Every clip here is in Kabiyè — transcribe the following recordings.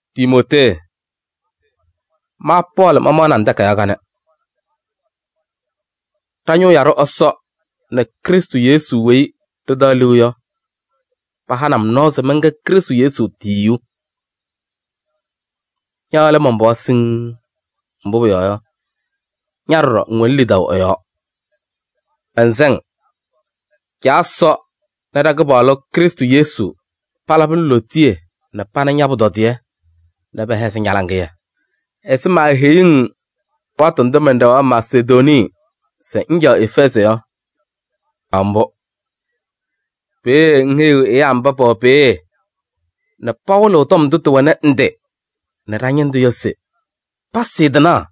Timootee! Ma Pɔɔlɩ mamaɣnɩ-ŋ takayaɣ kanɛ. Ɖa-ñʋʋ yaɖʋ Ɛsɔ nɛ Krɩstʋ Yesu weyi ɖɩtaɣ liu yɔ pahanɩ-m nɔɔ se mɛnkɛ Krɩstʋ Yesu tiyiyu. Ña lɛ man-pɩɣa siŋŋ, mbʋ pʋyɔɔ yɔ, ña ɖɔɖɔ ŋwɛnɩ lidaʋ ɛ-yɔɔ. Mɛnsɛ-ŋ: Caa Ɛsɔ nɛ ɖa-Kɩpaɣlʋ Krɩstʋ Yesu palabɩ-ŋ lootiye nɛ pana ña-pʋtɔdɩyɛ nɛ pɛhɛzɩ ña-laŋɩyɛ. Ɛzɩ maaheyuu-ŋ alɩwaatʋ ndʋ mɛnɖɛɣaɣ Masedonii se ŋcaɣ Efɛɛzɩ yɔ, caɣ mbʋ. Peeye ŋheyiɣ ɛyaa mba pɛwɛ peeye nɛ pawɩlɩɣ tɔm ndʋ tɩwɛ ndɩ nɛ ɖa-ñɩndʋ yɔ se pasɩɩ tɩnaɣ.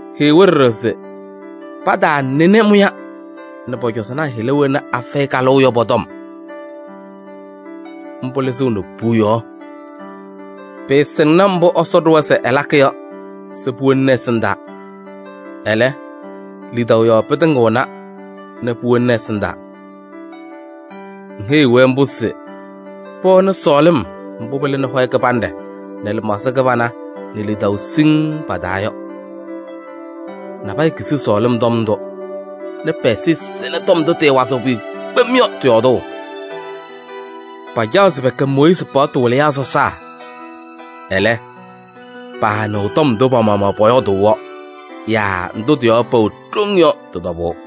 Heyi-wɛ ɖɔɖɔ se pataanɩnɩ mʋya nɛ pɔ-cɔzɔnaa hɩla wena afɛyɩ kalʋʋ yɔ pɔ-tɔm. Mbʋ lɩzɩɣnɩ puuyaɣ. Pɩɩsɩŋnɩ mbʋ Ɛsɔ ɖʋwa se ɛlakɩ yɔ se puwobini ɛsɩndaa. Ɛlɛ, lidaʋ yɔɔ pɩtɩŋɩɣna nɛ puwobini ɛsɩndaa. Ŋheyiɣ-wɛ mbʋ se pɛwɛnɩ sɔɔlɩm mbʋ pɩlɩnɩ hɔyɛ kɩbanɖɛ nɛ lɩmaɣza kɩbana nɛ lidaʋ siŋŋ pa-taa yɔ. Nabɛyɛ kizi sɔɔlɩm tɔm ndʋ nɛ pɛ-ɛza sɛnɩ tɔm ndʋ tɩɩwazɩɣ pʋyʋ kpem yɔ tɩ-yɔɔdʋʋ. Pacaɣ se pɛkɛ Mooyiizi paɣtʋ wɩlɩyaa sɔsaa. Ɛlɛ, paanɩɣ tɔm ndʋ pa-maɣmaɣ pɔyɔɔdʋʋ yɔ yaa ndʋ tɩ-yɔɔ pɛwɛ ɖoŋ yɔ tɩ-tɔbʋʋ.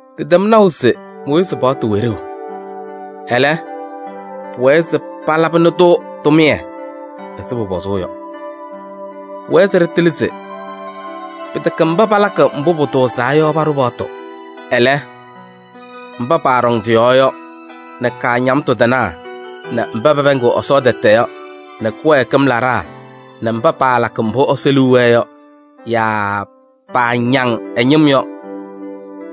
Ɖɩtɛm naʋ se Mooyiizi paɣtʋ wɛ ɖeu. Ɛlɛ, pʋwɛɛ se palabɩnɩ-tʋ tʋmɩyɛ ɛzɩ pʋpɔzʋʋ yɔ. Pʋwɛɛ se ɖɩtɩlɩ se: pɩtɛkɛ mba palakɩ mbʋ pʋtʋʋzaa yɔ paɖʋ paɣtʋ. Ɛlɛ, mba paaɖɔŋ tɩ-yɔɔ yɔ nɛ kaañamtʋ tɩnaa nɛ mba pɛpɛɛŋɩɣ Ɛsɔ tɛtɛ yɔ nɛ kɩwɛɛkɩm laɖaa nɛ mba paalakɩ mbʋ Ɛsɔ liu wɛɛ yɔ yaa paañaŋ ɛ-ñɩm yɔ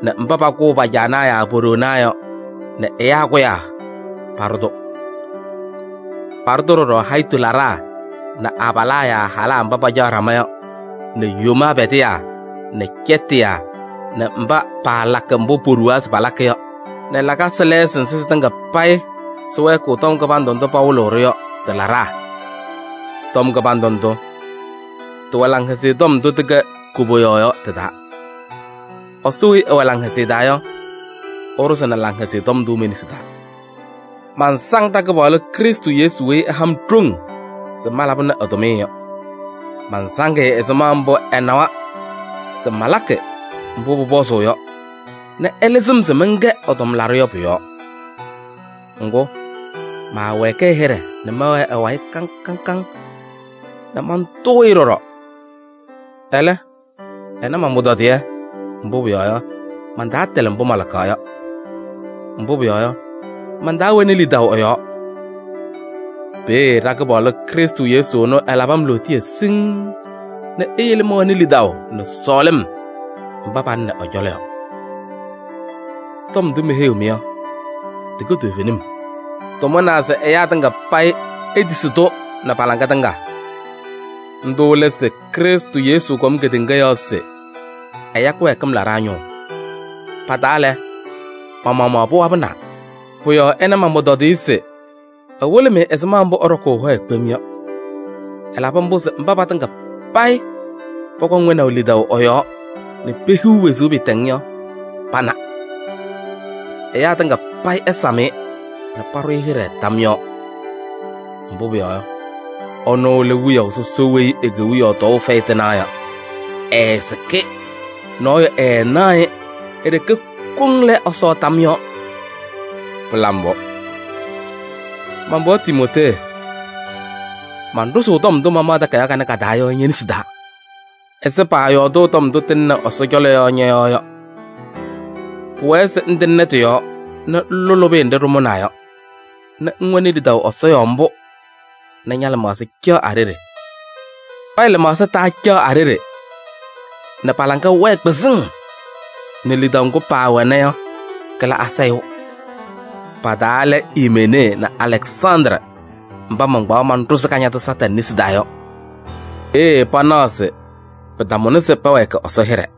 nɛ mba pakʋʋ pa-caanaa yaa po-ɖoonaa yɔ nɛ ɛyaa kʋyaa paɖʋ-tʋ. Paɖʋ-tʋ ɖɔɖɔ hayitu laɖaa nɛ abalaa yaa halaa mba pacaɣ ɖama yɔ nɛ yomaa pɛdɩyaa nɛ cɛtɩyaa nɛ mba paalakɩ mbʋ poɖuwaa se palakɩ yɔ nɛ lakasɩ lɛɛsɩ nzɩ sɩtɩŋa payɩ sɩwɛɛkɩɣ tɔm kɩbandʋ ndʋ pawɩlɩɣ-ɖʋ yɔ sɩ-laɖaa. Tɔm kɩbandʋ ndʋ, tɩwɛ Laŋhɛzɩyɛ Tɔm ndʋ tɩkɛ koboyaɣ yɔ tɩ-taa. Ɛsɔ weyi ɛwɛ laŋhɛzɩyɛ taa yɔ, ɛɖʋzɩnɩ Laŋhɛzɩyɛ Tɔm ndʋ me-nesi taa. Mansaŋ ɖa-Kɩpaɣlʋ Krɩstʋ Yesu weyi ɛha-m ɖoŋ se malabɩnɩ ɛ-tʋmɩyɛ yɔ. Mansaŋ-ɩ ɛzɩma mbʋ ɛnawa se malakɩ mbʋ pʋpɔzʋʋ yɔ nɛ ɛlɩzɩ-m se mɛnkɛ ɛ-tʋmlaɖʋ yɔ pʋ-yɔɔ. Ŋgʋ, maawɛɛkɩ ɛ-hɩɖɛ nɛ mɛwɛɛ ɛ-wayɩ kaŋ kaŋ nɛ mantʋʋ-ɩ ɖɔɖɔ. Ɛlɛ, ɛna man-pʋtɔdɩyɛ, mbʋ pʋyɔɔ yɔ, mantaatɩlɩ mbʋ malakaɣ yɔ. Mbʋ pʋyɔɔ yɔ, mantaawɛnɩ lidaʋ ɛ-yɔɔ. Peeye ɖa-Kɩpaɣlʋ Krɩstʋ Yesu ɛnʋ ɛlabɩ-m lootiye siŋŋ nɛ eyele mɛwɛnɩ lidaʋ nɛ sɔɔlɩm mba palɩnɩ ɛ-cɔlɔ yɔ. Tɔm ndʋ meheyiɣ-mɩ yɔ, tɩkɛ toovenim. Tɩmʋnaa se ɛyaa tɩŋa payɩ etisi-tʋ nɛ pa-laŋa tɩŋa. Ndʋ lɛ se Krɩstʋ Yesu kɔm kedeŋa yɔɔ se ɛya kɩwɛɛkɩm laɖaa ñʋʋ. Pa-taa lɛ, ma-maɣmaɣ pɩwabɩnaa. Pʋ-yɔɔ ɛna man-pʋtɔdɩyɛ se ɛwɩlɩ-mɩ ɛzɩma mbʋ ɛɖɔkʋʋ ɛ-hɔyɛ kpem yɔ. Ɛlabɩ mbʋ se mba patɩŋa payɩ pɔkɔŋ wɛnaʋ lidaʋ ɛ-yɔɔ nɛ pehiɣ wezuu pɩɩtɛŋ yɔ pana. Ɛyaa tɩŋa payɩ ɛsam-ɩ nɛ paɖʋ-ɩ hɩɖɛ tam yɔɔ. Mbʋ pʋyɔɔ yɔ, ɛnʋ lɛ Wiyaʋ sɔsɔ weyi e-kewiyaɣ tɔɔʋ fɛyɩ tɩnaɣ yɔ, ɛɛsɩkɩ, nɔɔyʋ ɛɛnaɣ-ɩ, e-ɖeke koŋ lɛ Ɛsɔ tam yɔɔ! Pɩla mbʋ! Man-pɩɣa Timootee, manɖʋzʋʋ tɔm ndʋ mamaɣ takayaɣ kanɛ ka-taa yɔ ñe-nesi taa ɛzɩ paayɔɔdʋʋ tɔm ndʋ tɩlɩnɩ Ɛsɔ cɔlɔ yɔ ñɔ-yɔɔ yɔ. Pʋwɛɛ se ŋtɩŋnɩ tɩ-yɔɔ nɛ ŋlʋ lʋbɩyɛ nɖɩ ɖɩmʋnaa yɔ nɛ ŋwɛnɩ lidaʋ Ɛsɔ yɔɔ mbʋ nɛ ña-lɩmaɣza caɣ a-ɖeɖe. Nabɛyɛ lɩmaɣza taacaɣ a-ɖeɖe nɛ pa-laŋa wɛɛ kpɩzɩŋ nɛ lidaʋ ŋgʋ paawɛna yɔ kɩla asayʋʋ. Pa-taa lɛ Imenee nɛ Alɛksandrɩ mba mankpaɣ manɖʋzɩ Kañadʋ Satanɩ nesi taa yɔ. Peeye panaɣ se pɩtamʋnɩ se pɛwɛɛkɩ Ɛsɔ hɩɖɛ.